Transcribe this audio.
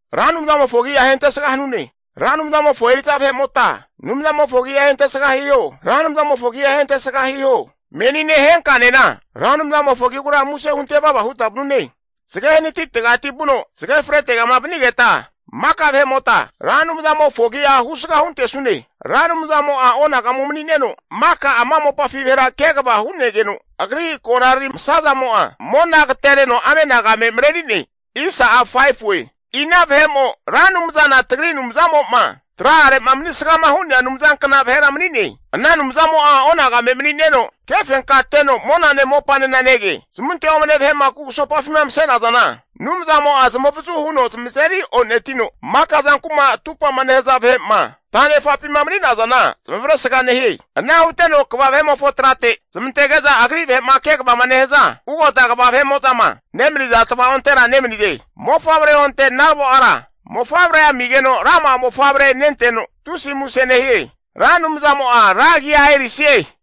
Ra Anumzamofo agi'a ahentesga hanune! Ra Anumzamofo eri'za vahe'mota Anumzamofo agi'a ahentesga hiho. Ra Anumzamofo agi'a ahentesga hiho. Menine henkanena Ra Anumzamofo agigura muse hunte vava huta vanune. Zage hanatitegati vuno zage fretegama vanigeta, maka vahe'mota, Ra Anumzamofo agi'a husga huntesune. Ra Anumzamo'a onagamu mani'neno, maka ama mopafi vahera kegava hu'negeno, Agri konarari masa zamo'a mona agatereno amenagame mareri'ne. Ina vahe'mo Ra Anumzana tagri Anumzamo'ma tra'are'ma manisgama hu'nea Anumzankna vahera mani'ne? Ana Anumzamo'a onagame mani'neno kefenkateno monane mopanena nege. Zamunte omne vahe'ma kugusopafima mase'nazana Anumzamo'a zamavazu huno zamazeri o'netino, maka zanku'ma atupa'ma nehaza vahe'ma ta'nefapima mani'nazana zamavaresga nehie. Ana huteno kva vahe'mofo trate zamantege'za, agri vahe'ma kegavama nehaza ugota kva vahe'mo'zama nemaniza tva'ontera nemanize. Mofavre onte naravo ara mofavre amigeno rama'a mofavre nenteno, tusi muse nehie. Ra Anumzamo'a ra agia erisie.